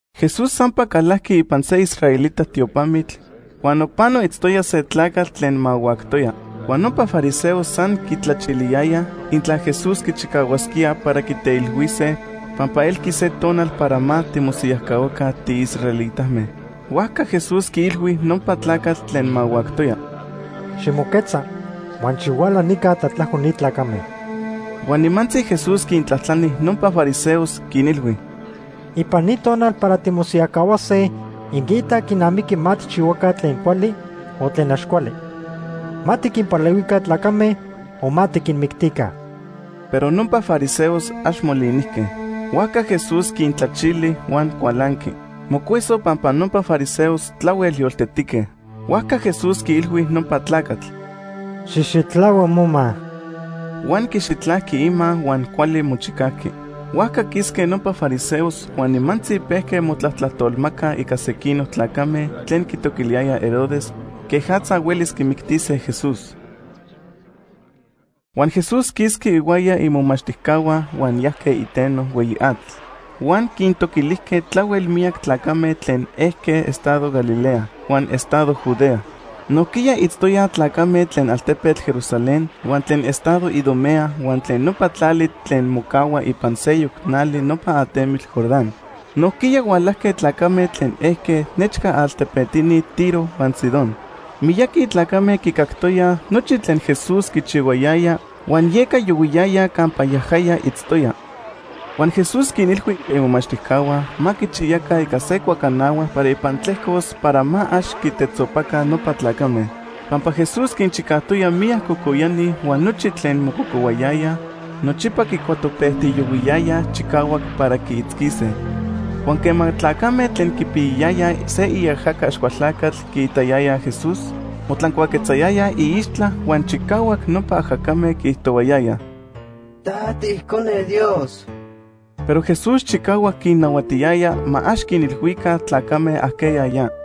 Jesús sampa calajqui ipan se israelita tiopamitl huan nopano itztoya se tlacatl tlen mahuactoya. Huan nopa fariseos san quitlachiliyayaj intla Jesús quichicahuasquía para quiteilhuise pampa elqui se tonal para ma timosiyajcahuaca tiisraelitame. Huajca Jesús quiilhui nopa tlacatl tlen mahuactoya: ―Ximoquetza huan xihuala nica tlatlajco ni tlacame. Huan nimantzi Jesús quintlajtlani nopa fariseos, quinilhui: ―¿Ipan ni tonal para timosiyajcahuase inquiitaj quinamiqui ma tijchihuaca tlen cuali o tlen ax cuali? ¿Ma tiquinpalehuica tlacame o ma tiquinmictica? Pero nopa fariseos ax molinijque. Huajca Jesús quintlachili huan cualanqui. Mocueso pampa nopa fariseos tlahuel yoltetique. Huajca Jesús quiilhui nopa tlacatl: ―¡Xijxitlahua moma! Huan quixitlajqui ima huan cuali mochicajqui. Huajca quisque nopa fariseos huan nimantzi pejque motlajtolmacaj ica sequinoc tlacame tlen quitoquiliyayaj Herodes quejatza huelis quimictise Jesús. Huan Jesús quisqui ihuaya imomachtijcahua huan yajque iteno hueyi atl. Huan quintoquilijque tlahuel miyac tlacame tlen ejque estado Galilea huan estado Judea. Nojquiya itztoyaj tlacame tlen altepetl Jerusalén, huan tlen estado Idumea huan tlen nopa tlali tlen mocahua ipan seyoc nali nopa atemitl Jordán. Nojquiya hualajque tlacame tlen ejque nechca altepetini Tiro huan Sidón. Miyaqui tlacame quicactoyaj nochi tlen Jesús quichihuayaya huan yeca yohuiyayaj campa yajaya itztoya. Huan Jesús quinilhui imomachtijcahua ma quichiyaca ica se cuacanahua para ipan tlejcos para ma ax quitetzopaca nopa tlacame. Pampa Jesús quinchicajtoya miyac cocoyani huan nochi tlen mococohuayayaj nochipa quicuatopejtiyohuiyayaj chicahuac para quiitzquise. Huan quema tlacame tlen quipiyayayaj se iajaca Axcualtlacatl quiitayayaj Jesús, motlancuaquetzayayaj iixtla huan chicahuac nopa ajacame quiijtohuayayaj: ―¡Ta tiIcone Dios! Pero Jesús chicahuac quinnahuatiyaya ma ax quinilhuica tlacame ajqueya yaja.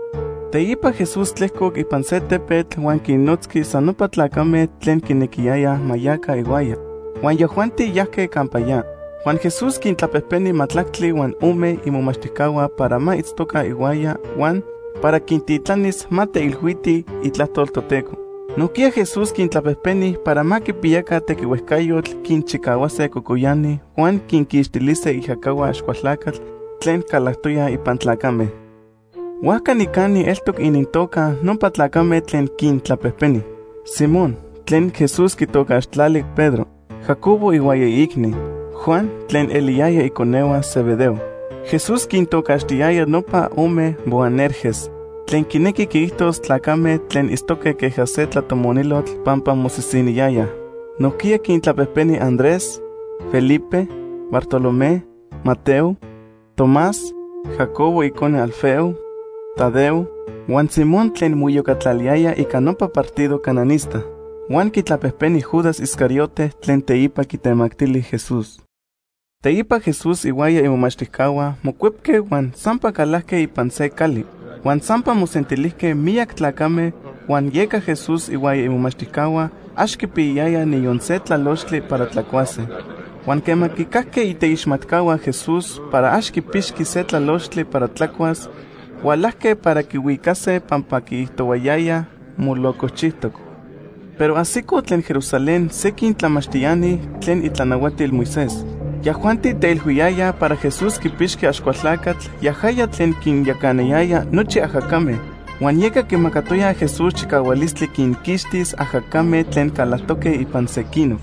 Teipa Jesús tlejcoc ipan se tepetl huan quinnotzqui san nopa tlacame tlen quinequiyaya ma yaca ihuaya, huan yajuanti yajque campa ya. Huan Jesús quintlapejpeni majtlactli huan ome imomachtijcahua para ma itztoca ihuaya huan para quintitlanis ma teilhuitij itlajtol Toteco. Nojquiya Jesús quintlapejpeni para ma quipiyaca tequihuejcayotl quinchicahuase cocoyani huan quinquixtilise iajacahua Axcualtlacatl tlen calactoyaj ipan tlacame. Huajca nicani eltoc inintoca nopa tlacame tlen quintlapejpeni: Simón, tlen Jesús quitocaxtlali Pedro, Jacobo ihuaya iicni, Juan, tlen eliyayaj iconehua Zebedeo. Jesús quintocaxtiyaya nopa ome Boanerges, tlen quinequi quiijtos tlacame tlen itztoque queja se tlatomonilotl pampa mosisiniyayaj. Nojquiya quintlapejpeni Andrés, Felipe, Bartolomé, Mateo, Tomás, Jacobo icone Alfeo, Tadeo huan Simón tlen moiyocatlaliyaya ica nopa partido cananista. Huan quitlapejpeni Judas Iscariote tlen teipa quitemactili Jesús. Teipa Jesús ihuaya imomachtijcahua mocuepque huan sampa calajque ipan se cali. Huan sampa mosentilijque miyac tlacame, huan yeca Jesús ihuaya imomachtijcahua ax quipiyayayaj niyon se tlalochtli para tlacuase. Huan quema quicajque iteixmatcahua Jesús para ax quipixqui se tlalochtli para tlacuas, hualajque para quihuicase pampa quiijtohuayayaj: “Molocojchijtoc.” Pero ajsicoj tlen Jerusalén sequin tlamachtiani tlen itlanahuatil Moisés. Yajuanti teilhuiyayaj para Jesús quipixqui Axcualtlacatl yajaya tlen quinyacana nochi ajacame, huan yeca quimacatoya Jesús chicahualistli quinquixtis ajacame tlen calactoque ipan sequinoc.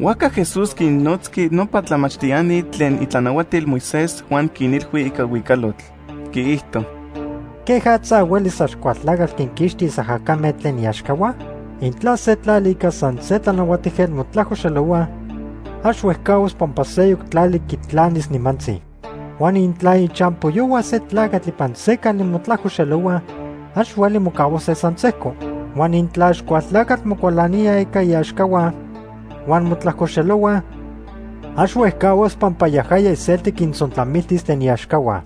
Huajca Jesús quinnotzqui nopa tlamachtiani tlen itlanahuatil Moisés huan quinilhui ica huicalotl, quiijto: “¿Quejatza huelis Axcualtlacatl quinquixtis ajacame tlen iaxcahua? Intla se tlali ica san se tlanahuatijquetl motlajcoxelohua, ax huejcahuas pampa seyoc tlali quitlanis nimantzi. Huan intla ichampoyohua se tlacatl ipan se cali motlajcoxelohuaj, ax hueli mocahuase san sejco. Huan intla Axcualtlacatl mocualanía ica iaxcahua, huan motlajcoxelohuaj, ax huejcahuas pampa yajaya iselti quintzontlamiltis tlen iaxcahua.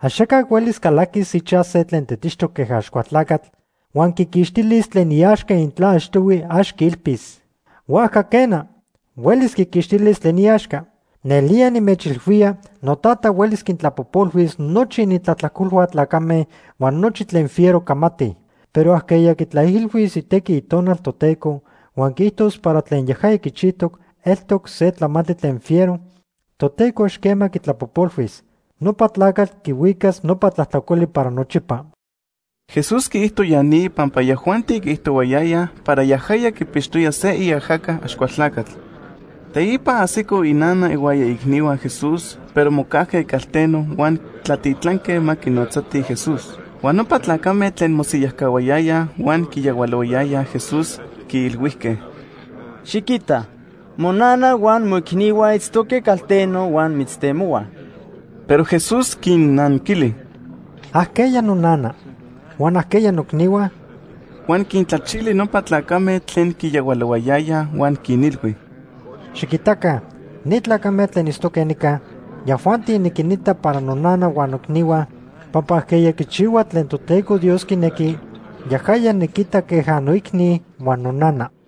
“Axaca huelis calaquis ichaj se tlen tetixtoc queja Axcualtlacatl huan quiquixtilis tlen iaxca intla achtohui ax quiilpis. Huajca quena, huelis quiquixtilis tlen iaxca. “Nelía nimechilhuía noTata huelis quintlapojpolhuis nochi inintlajtlacolhua tlacame huan nochi tlen fiero camatij, pero ajqueya quitlaijilhuis itequi Itonal Toteco huan quiijtos para tlen yajaya quichijtoc eltoc se tlamantli tlen fiero, Toteco ax quema quitlapojpolhuis. Nopa tlacatl quihuicas nopa tlajtlacoli para nochipa.” Jesús quiijto ya ni pampa yajuanti quiijtohuayayaj para yajaya quipixtoya se iajaca Axcualtlacatl. Teipa ajsico inana ihuaya iicnihua Jesús, pero mocajque calteno huan tlatitlanque ma quinotzatij Jesús. Huan nopa tlacame tlen mosiyajcahuayayaj huan quiyahualohuayayaj Jesús, quiilhuijque: ―Xiquita, monana huan moicnihua itztoque calteno huan mitztemohuaj. Pero Jesús quinnanquili: ―¿Ajqueya nonana? huan ¿ajqueya noicnihua? Huan quintlachili nopa tlacame tlen quiyahualohuayayaj huan quinilhui: ―Xiquitaca ni tlacame tlen itztoque nica, yajuanti niquinita para nonana huan noicnihua, pampa ajqueya quichihua tlen Toteco Dios quinequi, yajaya niquita queja noicni huan nonana.